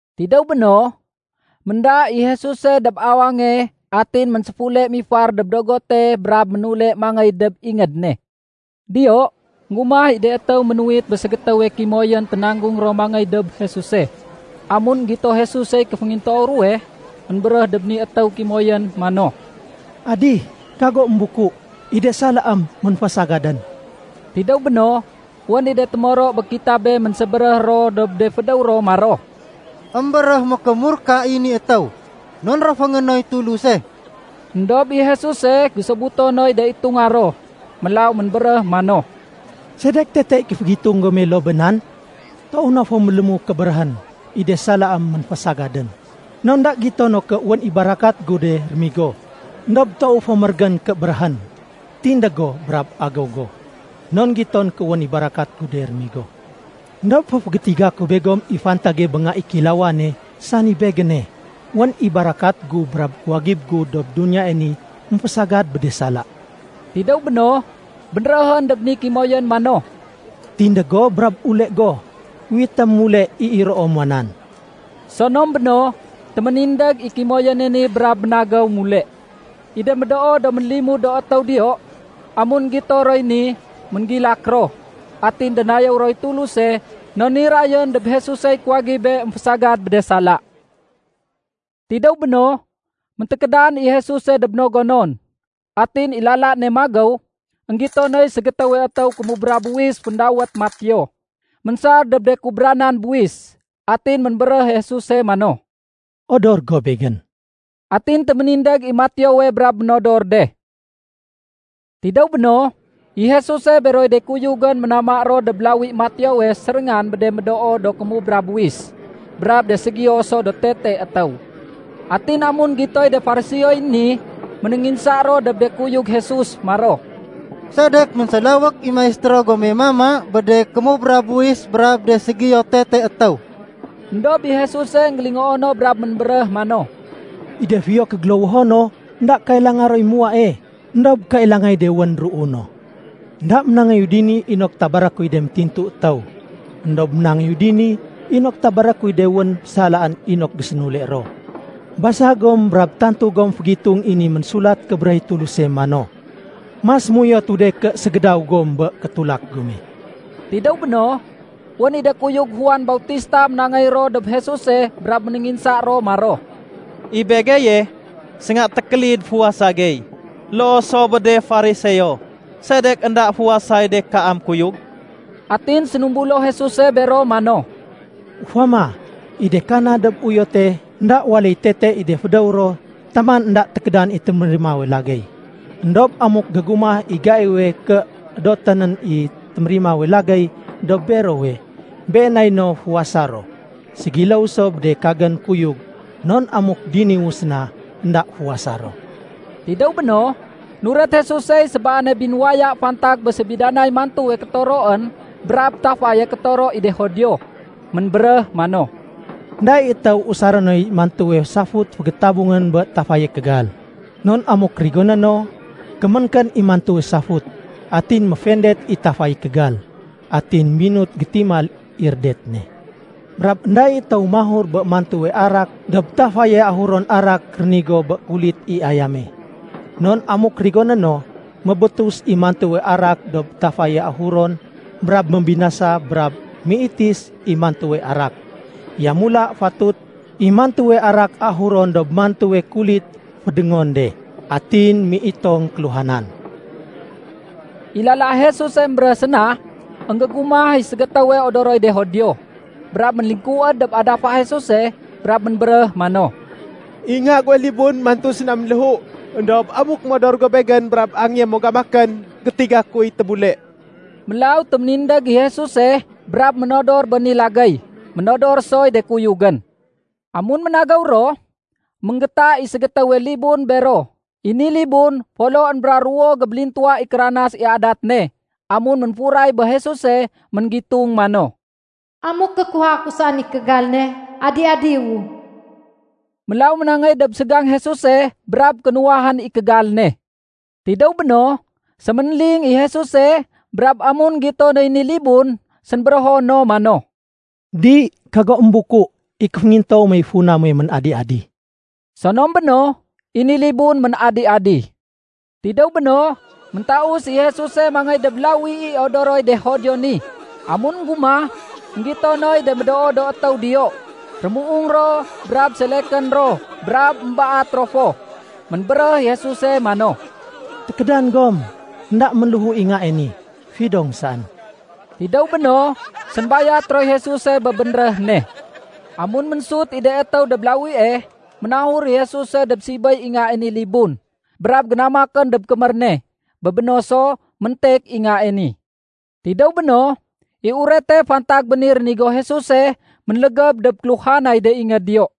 Tidéw béno, ménda i Jesuse dob awange atin ménséfule mifar dob dogote brab ménule mangéy dob ingéd ne. Diyo, énggumah i de étéw ménuwit bé ségétéwe kimoyén ténanggung ro mangéy dob Jesuse. Amun énggito Jesusey kéféngintoow ruwe, ménbéréh dob ni étéw kimoyén mano, “Adih, kago émbuku! I de salaém ménfésagadén.” Tidéw béno, wén i de témoro bé kitabé ménsébéréh ro dob de fédéw ro maro, “Embéréh mékémurka i ni étéw, non réféngé noy Tuluse.” Edob i Jesuse gésobuto noy de itunga ro. Mélaw ménbéréh mano, “Sedek tete i kéfégitung gome loo bé nan? Toow na fo mélému ké béréhén, ‘I de salaém ménfésagadén.’ Non énda gito no ké wén i barakat gu de rémigo. Endob toow fo mérégén ké béréhén. ‘Tindég go brab agéw go.’ Non giton ké wén i barakat gu de rémigo. Endob féfégétiga ku begom i fantage bé Nga i Kéilawane, sani Begéne. Wén i barakat gu brab kuwagib gu dob duniyae ni émfésagad bé de sala.” Tidéw béno, bénréhén dob ni kimoyén mano. “Tindég go brab ule go unwitém mule i iroo muwa nan.” Sonom béno, téménindég i kimoyéne ni brab ménagéw mule. I de médoo do ménlimud do étéw diyo, amun énggito roy ni, ménggilak ro, atin dénayéw roy Tuluse non nirayén dob Jesusey kuwagibé émfésagad bé de sala. Tidéw béno, méntékédan i Jesuse dob no gonon. Atin i lala ne magéw, énggito noy ségétéwe étéw kémubra buwis féndawét Mateo, ménsar dob de kubranan buwis. Atin ménbéréh i Jesuse mano, “Odor go Begén.” Atin téménindég i Mateowe brab ménodor de. Tidéw béno, i Jesuse beroy de kuyugén ménama ro dob lawi Mateowe séréngan bé de médoo do kémubra buwis brab de ségiyo so do tete étéw. Atin amun énggitoy de Fariseoy ni, ménénginsa ro dob de kuyug Jesus maro, “Sedek ménsélawék i Maistéro gome mama bé de kémubra buwis brab de ségiyo tete étéw?” Endob i Jesuse énggélingoo no brab ménbéréh mano, “I de fiyo kégélowoho no, énda kailanga roy muwae, éndob kailangay de wén déruu no. Enda ménangéyu dini inok tabaré kuy de métintu étéw, éndob ménangéyu dini inok tabaré kuy de wén salaén inok gésénule ro. Basa gom brab tantu gom fégitung i ni Ménsulat Kébéréh i Tuluse mano, ‘Mas méuyotu de ké ségédaw gom bé kétulak gome.’” Tidéw béno, wén i de kuyug Juan Bautista ménangéy ro dob Jesuse brab ménénginsa ro maro, “I begeye, sénga tékélid fuwasa gey. Loo so bé de Fariseo. Sedek énda fuwasay de kaam kuyug?” Atin sénumbulo Jesuse bero mano, “Ufama, i de kana dob uyote énda waléy tete i de fédéw ro taman énda tékédan i témérimawe lagéy. Endob amuk gégumah i gaiwe ké édotén nén i témérimawe lagéy dob berowe, been nay no fuwasa ro. Ségiléw so bé de kagén kuyug, non amuk diniwu séna, énda fuwasa ro.” Tidéw béno, nuret Jesusey sébaane binuwaya fantag bé sébidanay mantuwe kétoroén brab tafaye kétoro i de Judio. Ménbéréh mano, “Enda i étéw usaré noy mantuwe safut fégétabungén bé tafaye kégal. Non amuk rigoné no, kéménkén i mantuwe safut, atin méfendet i tafaye kégal, atin minut gétimal i rédet ne. Brab énda i étéw mahur bé mantuwe arak dob tafaye ahuron arak rénigo bé kulit i ayame. Non amuk rigoné no, mébétus i mantuwe arak dob tafaye ahuron brab mébinasa brab méitis i mantuwe arak. Yamula fatut i mantuwe arak ahurén dob mantuwe kulit fédéngon de, atin méitong kéluhanan.” I lala Jesuse émbéréh séna, énggégumah i ségétéwe odoroy de Judio, brab ménlingkuwéd dob adafa Jesuse brab ménbéréh mano, “I nga guwe libun mantu séna ménléhu. Endob amuk modor go begén brab angéyé mo gamakén, gétiga kuy tébule.” Mélaw téménindég i Jesuse brab ménodor bé ni lagéy. Ménodor soy de kuyugén. Amun ménagéw ro, ménggéta i ségétéwe libun bero. I ni libun foloén bra ruwo gébélintuwa i kéranas i adat ne. Amun ménfuray bé Jesuse, ménggitung mano, “Amuk gékuwaha ku saén i kégal ne, adi-adiwu.” Mélaw ménangéy dob ségang Jesuse brab kénuwahén i kégal ne. Tidéw béno, séménling i Jesuse brab amun énggito noy ni libun, sénbérého no mano, “Di, kago émbuku. I kéféngintoow mey funa muwe ménadi-adi.” Sonom beno, i ni libun ménadi-adi. Tidéw béno, méntaus i Jesuse mangéy dob lawi i odoroy de Judio ni. Amun énggumah, énggito noy de médoo do étéw diyo. Rémuung ro brab selekén ro brab émbaat ro fo. Ménbéréh i Jesuse mano, “Tékédan gom! Enda ménléhu i ngae ni. Fidong saén.” Tidéw béno, sénbayat roy Jesuse bé bénréh ne. Amun ménsut i de étéw dob lawie, ménahur i Jesuse dob sibéy i ngae ni libun, brab génamakén dob kémér ne. Bé béno so, méntek i ngae ni. Tidéw béno, i urete fantag bé ni rénigo Jesuse ménlégéb dob kéluhanay de ingéd diyo.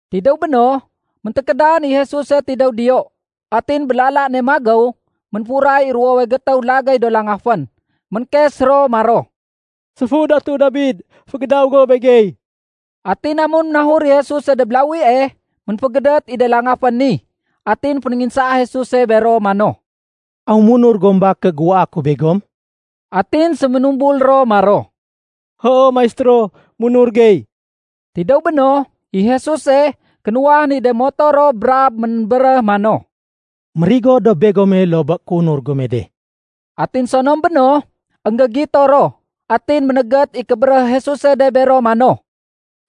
Tidéw béno, méntékédan i Jesuse tidéw diyo. Atin bé lala ne magéw, ménfuray i ruwowe gétéw lagéy do langafén. Ménkes ro maro, “Séfu Datu Dabid, fégédaw go begey!” Atin amun ménahur i Jesuse dob lawie, ménfégédét i de langafén ni. Atin fénénginsaa Jesuse bero mano, “Aw munur gom ba ké géuwaa ku begom?” Atin séménumbul ro maro, “Hoo Maistéro, munur gey.” Tidéw béno, i Jesuse kénuwahén i de moto ro brab ménbéréh mano, “Mérigo dob begome loo bé kéunur gome de.” Atin sonom béno, énggégito ro. Atin ménégét i kébéréh Jesuse de bero mano,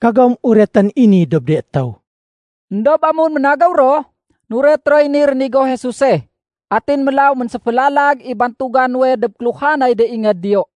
“Kagom uretén i ni dob de étéw.” Endob amun ménagéw ro, nuret roy ni rénigo Jesuse. Atin mélaw ménséfélalag i bantuga nuwe dob kéluhanay de ingéd diyo.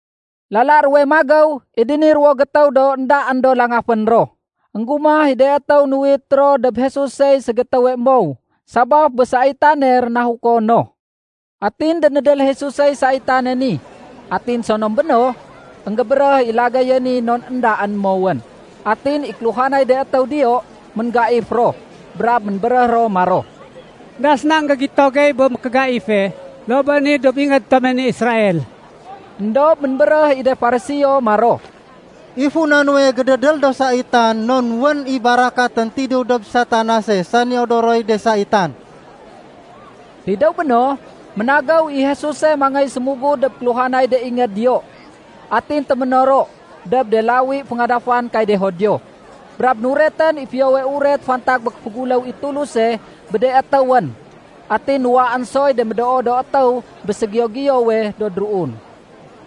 Lala ruwe magéw i de ni ruwo gétéw do éndaén do langafén ro, énggumah i de étéw nuwit ro dob Jesusey ségétéwe mow sabaf bé saitane rénahuko no. Atin dénédél Jesusey saitane ni. Atin sonom béno, énggébéréh i lagéye ni non éndaén mowén. Atin i kéluhanay de étéw diyo ménggaif ro, brab ménbéréh ro maro, “Enda séna énggégito gey bé mékégaife loo bé ni dob ingéd tome ni Israel.” Endob ménbéréh i de Fariseo maro, “I funa nuwe gédédél do saitan non wén i barakatén tidéw dob Satanase sani odoroy de saitan.” Tidéw béno, ménagéw i Jesuse mangéy sémugud dob kéluhanay de ingéd diyo. Atin téménoro dob de lawi féngadafan kay de Judio, brab nuretén i Fiyowe Uret fantag bé kéféguléw i Tuluse bé de étéwén. Atin nuwaén soy de médoo do étéw bé ségiyo-giyowe do déruun.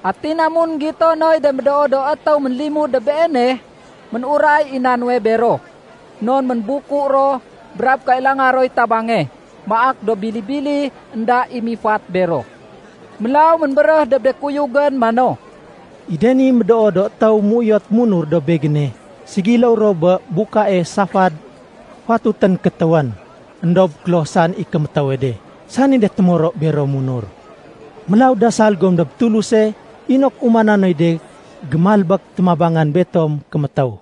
Atin amun énggito noy de médoo do étéw ménlimud dob Beene, ménuray i na nuwe bero, non ménbuku ro brab kailanga roy tabange. Maak do bili-bili énda i mifat bero. Mélaw ménbéréh dob de kuyugén mano, “I de ni do médoo do étéw méuyot munur dob Begéne, ségiléw ro bé bukae safad fatutén kétéwén. Endob kloh saén i kémétéwe de, sani de témoro bero munur. Mélaw dasal gom dob Tuluse inok umana noy de gémalbék témabangan betom kémétéw.”